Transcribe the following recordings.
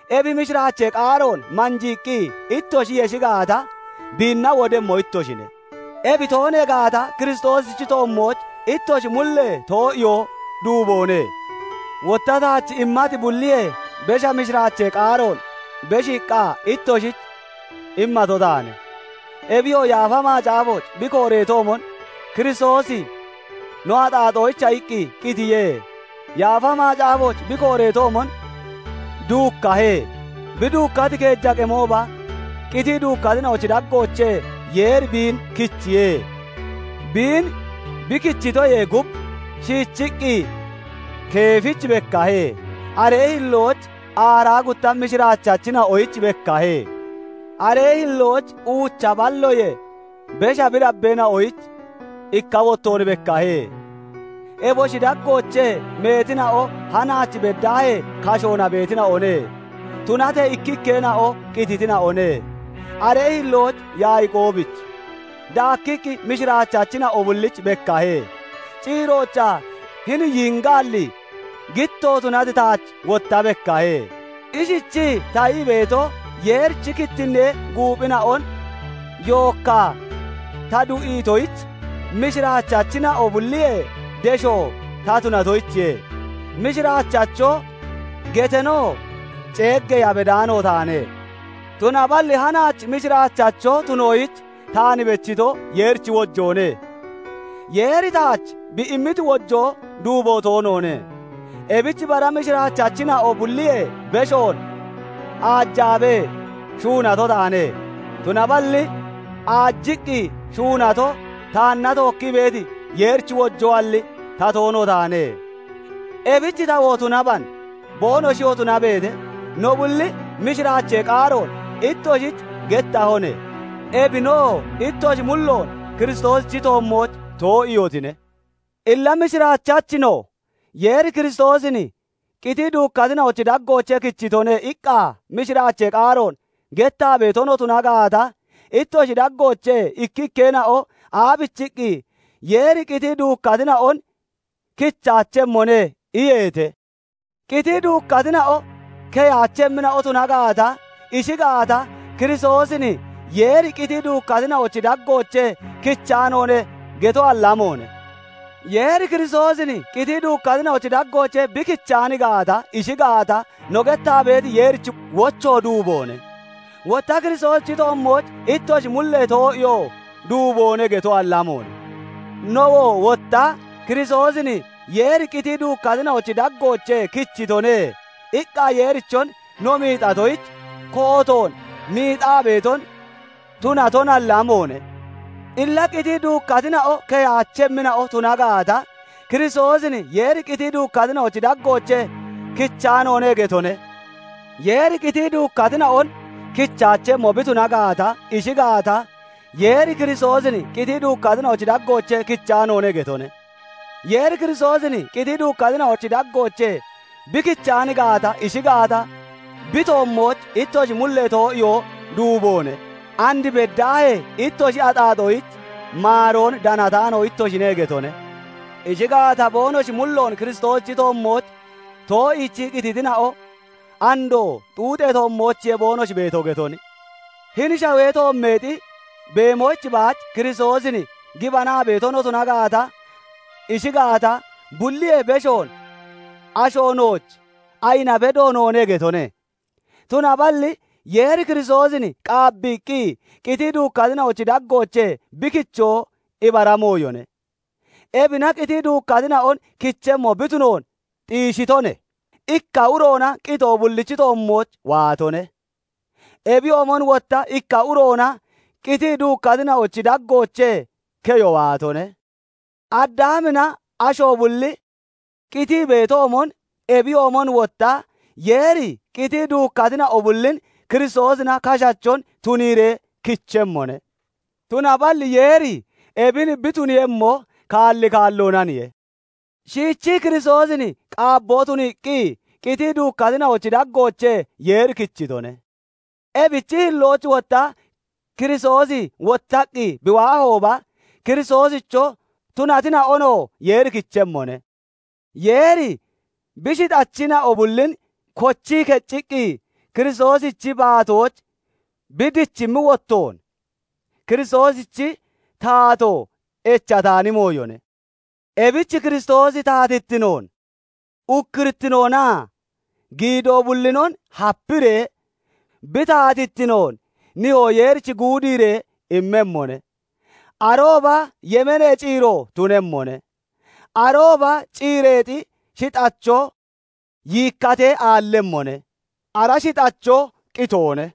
Ebi mishiraachee qaaroon manjiiqqi ittoshi yeshi gaata, biinna wodemmo ittoshine. Ebi toonee gaata, Kiristoosichi toommooch ittoshi mullee too'iyoo duuboone. Wotta taach immati bulliyee besha mishiraachee qaaroon beshiiqqa ittoshich immato taane. Ebiyoo Yaafa Macaafooch bi kooreetoomon, Kiristoosi no axaaxoyicha iqqi qitiye; Yaafa Macaafooch bi kooreetoomon, duukkahe; bi duukkati keeja qemooba qitii duukkatina'ochi daggoochee Yeeri biin kichiye. Biin bi kichitoyee gub, shiichiqqi Keefich bekkahe; aree hillooch aaraa gutta mishiraachachina'oyich bekkahe. Aree hillooch uucha balloyee besha bi dabbeena'oyich ikka wottoon bekkahe. Eboshi daggoochee meetina'o hanaach beddaahee kashoona beetina'one; tunatee ikkikkeena'o qititina'one. Aree hillooch Yaaqoobich, daakkiqqi mishiraachachina'o bullich bekkahe. Ciiroochaa hini yiingaalli gitto tunati taach wotta bekkahe. Ishichii ta ii beeto, Yeerichi kittinnee guuphina'on yookkaa ta du'iitoyich, mishiraachachina'o bulliyee desho ta tunatoyichiye; "Mishiraachacho" geteenoo ceeggeeya bedaano taane. Tunaballi hanaach mishiraachacho tunoyich taan bechito Yeerichi wojoone; Yeeri taach bi immiti wojoo duubo toonoone. Ebich bara mishiraachachina'o bulliyee beshoon aajaabee shuunato taane; tunaballi aajiqqi shuunato, taanna tookkii beeti Yeerichi wojoalli, ta toono taane. Ebich tawoo tunaban, boonoshiyoo tunabeete, no bulli mishiraachee qaaroon ittoshich gettahone; ebinoo ittoshi mulloon Kiristoosichi toommooch too'iihotine. Illa mishiraachachi no "Yeeri Kiristoosin qitii duukkatina'ochi daggoochee kichitone" iqqa mishiraachee qaaroon gettaa beeto no tuna gaata, ittoshi daggoochee ikkikkeena'o aabichiqqi, "Yeeri qitii duukkatina'on kichaachemmone" iyeete? Qitii duukkatina'o keyaachemmina'o tuna gaata, ishi gaata, "Kiristoosin Yeeri qitii duukkatina'ochi daggoochee kichaanoone" getoalli amoone! Yeeri Kiristoosin qitii duukkatina'ochi daggoochee bi kichaan gaata, ishi gaata, no gettaa beeti Yeerichi wocho duuboone; wotta Kiristoosichi toommooch ittoshi mullee too'iyoo duuboone getoalli amoone! Nowoo wotta "Kiristoosin Yeeri qitii duukkatina'ochi daggoochee kichitone" iqqa Yeerichon no miixatoyich, kootoon miixaa beeton tunatonalli amoone! Illa qitii duukkatina'o keyaachemmina'o tuna gaata, Kiristoosin Yeeri qitii duukkatina'ochi daggoochee kichaanoone getone. Yeeri qitii duukkatina'on kichaachemmo bi tuna gaata, ishi gaata, "Yeeri Kiristoosin qitii duukkatina'ochi daggoochee kichaanoone" getone. Yeeri Kiristoosin qitii duukkatina'ochi daggoochee bi kichaan gaata, ishi gaata, bi toommooch ittoshi mullee too'iyoo duuboone; and beddaahee ittoshi axaaxoyich maaroon danataano ittoshine getone. Ishi gaata, boonoshi mulloon Kiristoosichi toommooch too'iichii qititina'o andoo xuuxee toommoochiye boonoshi beeto getone. Hini shawee toommeexi beemoyich baach Kiristoosin gibanaa beeto no tuna gaata, ishi gaata, bulliyee beshoon asho nooch ayina bedo noone getone. Tunaballi Yeeri Kiristoosin qaabbiiqqi qitii duukkatina'ochi daggoochee bi kichoo ibara mooyone; ebina qitii duukkatina'on kichemmo bi tunoon xiishitone. Ikka uroona qitoo bullichi toommooch waatone; ebiyoomon wotta ikka uroona qitii duukkatina'ochi daggoochee keyo waatone. Addaamina asho bulli qitii beetoomon, ebiyoomon wotta Yeeri qitii duukkatina'o bullin Kiristoosina kashachon tuniiree kichemmone. Tunaballi Yeeri ebin bi tuniiyemmo kaalli kaalloonaniye; shiichii Kiristoosin qaabboo tuniiqqi, qitii duukkatina'ochi daggoochee Yeeri kichitone; ebichi hillooch wotta Kiristoosi wottaqqi bi waahooba, Kiristoosicho tunatina'onoo Yeeri kichemmone. Yeeri bi shixachina'o bullin kochii kecciqqi Kiristoosichi baatooch bi dichimmi wottoon, Kiristoosichi taato echataani mooyone. Ebich Kiristoosi taatittinoon, ukkurittinoonaa giidoo bullinon hapiree bi taatittinoon Nihoo Yeerich guudiiree immemmone. Arooba yemeenee ciiro tunemmone. Arooba ciireexi shixacho yiikkatee aallemmone; ara shixacho qitoone.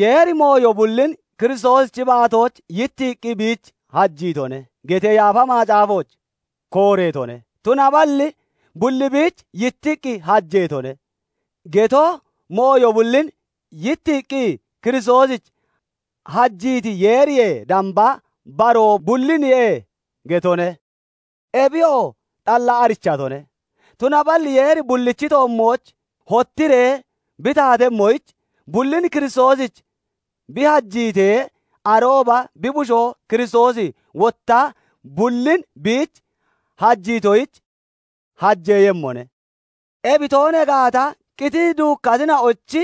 "Yeeri mooyo bullin Kiristoosichi baatooch yittiiqqi biich hajiitone" getee Yaafa Macaafooch kooreetone; tunaballi "Bulli biich yittiqqi hajeetone" geto, mooyo bullin yittiiqqi Kiristoosich hajiiti Yeeriyee damba baroo bulliniye getone; ebiyoo xalla arichatone. Tunaballi Yeeri bullichi toommooch hottiree bi taatemmoyich, bullin Kiristoosich bi hajiitee, arooba bi bushoo Kiristoosi wotta bullin biich hajiitoyich hajeeyemmone. Ebi toonee gaata, qitiqqi duukkatina'ochi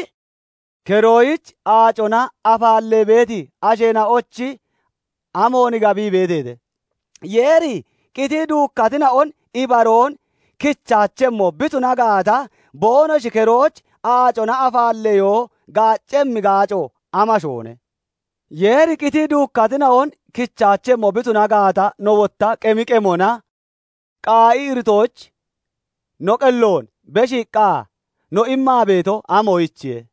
keroyich aacona afaallee beeti asheena'ochi, amoon gabii beeteete? Yeeri qitii duukkatina'on ibaroon kichaachemmo bi tuna gaata, boonoshi keroyich aacona afaalleyo gaaccemmi gaaco amashoone? Yeeri qitii duukkatina'on kichaachemmo bi tuna gaata, no wotta qemi qemona qaa'i iritoyich no qelloon beshiiqqa no immaa beeto, amoyichiye?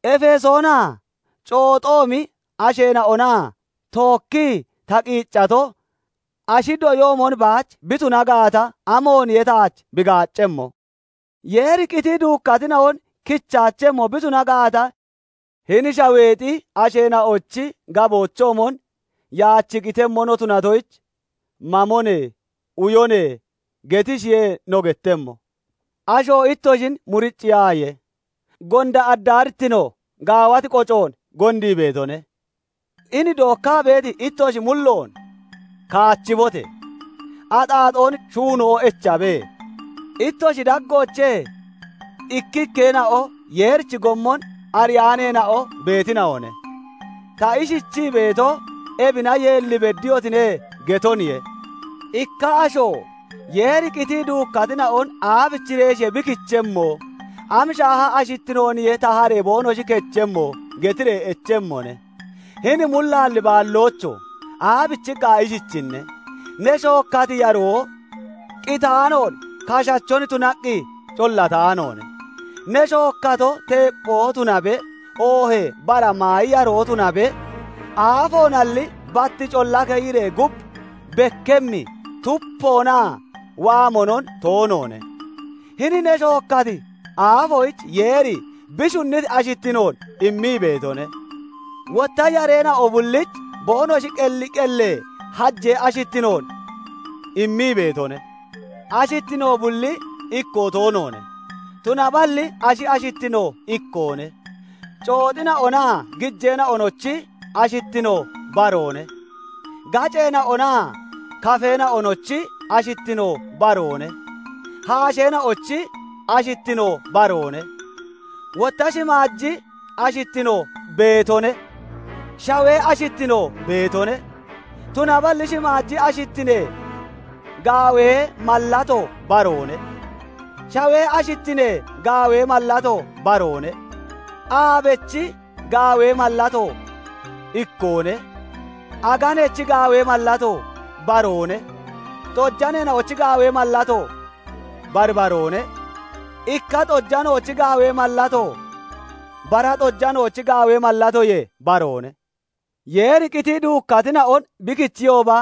Efesoonaa cooxoomi asheena'ona tookkii ta qiiccato ashi doyoomon baach bi tuna gaata, amooniye taach bi gaaccemmo? Yeeri qitii duukkatina'on kichaachemmo bi tuna gaata, hini shaweexi asheena'ochi gaboochoomon "Yaach qitemmo no tunatoyich, mamone; uyone" getishiye no gettemmo, Asho ittoshin muriciyaaye; "Gonda addaarittino gaawati qocoon gondii beetone". Hini dookkaa beeti ittoshi mulloon kaachibote! Axaaxoon shuuno echabe. Ittoshi daggoochee ikkikkeena'o Yeerichi gommon ariyaaneena'o beetina'one. Ta ishichii beeto, "Ebina yeelli beddiyotine" getoniye. Ikka asho "Yeeri qitii duukkatina'on aabichireeshiye bi kichemmo? Am shaaha ashittinooniye taharee boonoshi kechemmo?" getiree echemmone. Hini mullaalli baalloocho! Aabichiqqa ishichinne? Ne shookkati yaroo qitaanoon kashachon tunaqqi collataanoone. Ne shookkato, teepphoo tunabe, oohee bara maayi yaroo tunabe, aafoonalli, bat colla keyiree gub bekkemmi tupoonaa waamonon toonoone. Hini ne shookkati aafoyich Yeeri bi shunniti ashittinoon immii beetone; wotta yareena'o bullich boonoshi qelli qellee hajee ashittinoon immii beetone. Ashittino bulli ikkoo toonoone; tunaballi ashi ashittino ikkoone; cooxina'onaa gijeena'onochi ashittino baroone; gaceena'onaa kafeena'onochi ashittino baroone; haasheena'ochi ashittino baroone. Wotta shimaaji ashittino beetone; shawee ashittino beetone; tunaballi shimaaji ashittinee gaawee mallato baroone; shawee ashittinee gaawee mallato baroone. Aabechi gaawee mallato ikkoone; aganechi gaawee mallato baroone; xojaneena'ochi gaawee mallato bari baroone; ikka xojanoochi gaawee mallato bara xojanoochi gaawee mallatoyee baroone. Yeeri qitii duukkatina'on bi kichiyooba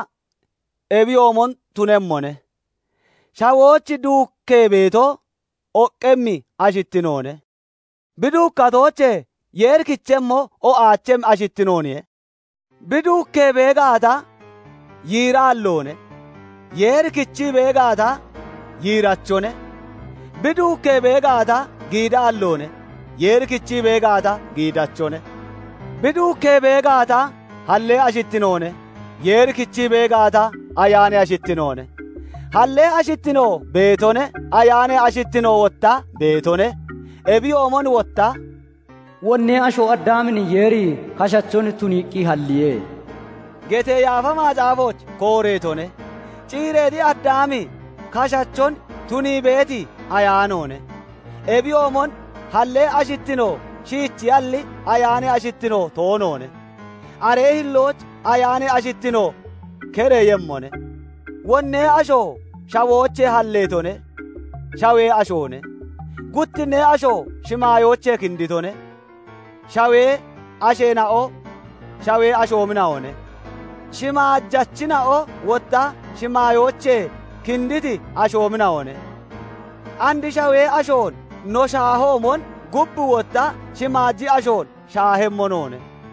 ebiyoomon tunemmone. Shawooch duukkee beeto oqqemmi ashittinoone; bi duukkatoochee Yeeri kichemmo o'aachemmi ashittinooniye. Bi duukkee bee gaata, yiiraalloone; Yeeri kichii bee gaata, yiirachone. Bi duukkee bee gaata, giidaalloone; Yeeri kichii bee gaata, giidachone. Bi duukkee bee gaata, hallee ashittinoone; Yeeri kichii bee gaata, ayaanee ashittinoone. Halle ashittino beetone; ayaanee ashittino wotta beetone. Ebiyoomon wotta "Wonnee asho Addaamin Yeeri kashachon tuniiqqi halliye" getee Yaafa Macaafooch kooreetone; ciireexi Addaami kashachon tunii beeti ayaanoone. Ebiyoomon hallee ashittino shiichiyalli, ayaanee ashittino toonoone; aree hillooch ayaanee ashittino kereeyemmone. Wonnee asho shawoochee halleetone; shawee ashoone. Guttinnee asho shimaayoochee kinditone; shawee asheena'o shawee ashoomina'one. Shimaajachina'o wotta shimaayoochee kinditi ashoomina'one. And shawee ashoon no shaahoomon, gub wotta shimaaji ashoon shaahemmo noone.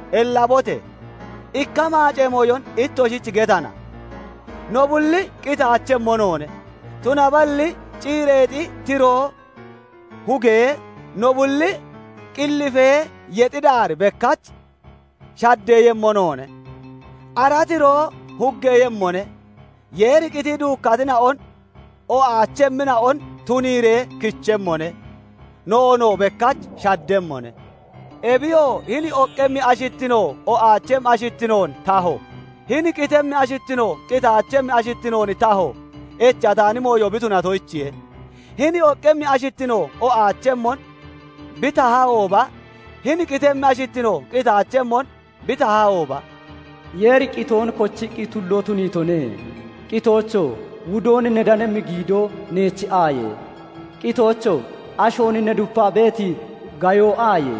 Ellabote! Ikka maacee mooyon ittoshich getana; no bulli qitaachemmo noone; tunaballi ciireexi tiroo hugee, no bulli qillifee yexxi daar bekkach shaddeeyemmo noone. Ara tiroo huggeeyemmone; Yeeri qitii duukkatina'on o'aachemmina'on tuniiree kichemmone; noonoo bekkach shaddemmone. Ebiyoo hini oqqemmi ashittino o'aachemmi ashittinoon taho, hini qitemmi ashittino qitaachemmi ashittinoon taho echataani mooyo bi tunatoyichiye. Hini oqqemmi ashittino o'aachemmon bi tahahooba, hini qitemmi ashittino qitaachemmon bi tahahooba, "Yeeri qitoon kochiqqi tulloo tuniitone". "Qitoocho! Wudoon ne danemmi giidoo, neech aaye? Qitoocho! Ashoon ne dupaa beeti gayo, aaye?"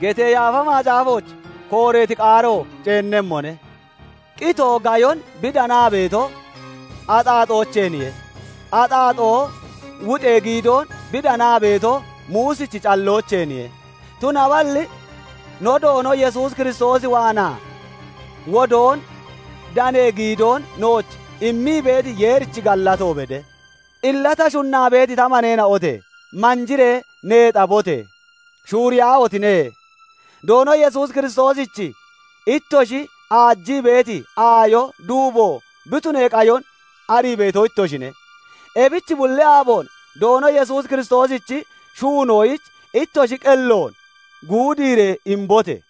getee Yaafa Macaafooch kooreeti qaaro ceennemmone. Qitoo gayon bi danaa beeto, axaaxoocheeniye; axaaxoo wuxee giidoon bi danaa beeto, Muusichi calloocheeniye; tunaballi no Doono Yesuus Kiristoos waanaa wudoon danee giidoon nooch immii beeti Yeerich gallato bede. Illa ta shunnaa beeti ta maneena'ote! Manjiree neexabote! Shuuriyaahotine! Doono Yesuus Kiristoosich ittoshi aajii beeti aayo duubo bi tunee qayon ariito ittoshine. Ebich bulli aaboon Doono Yesuus Kiristoosichi shuunoyich ittoshi qelloon guudiiree imbote!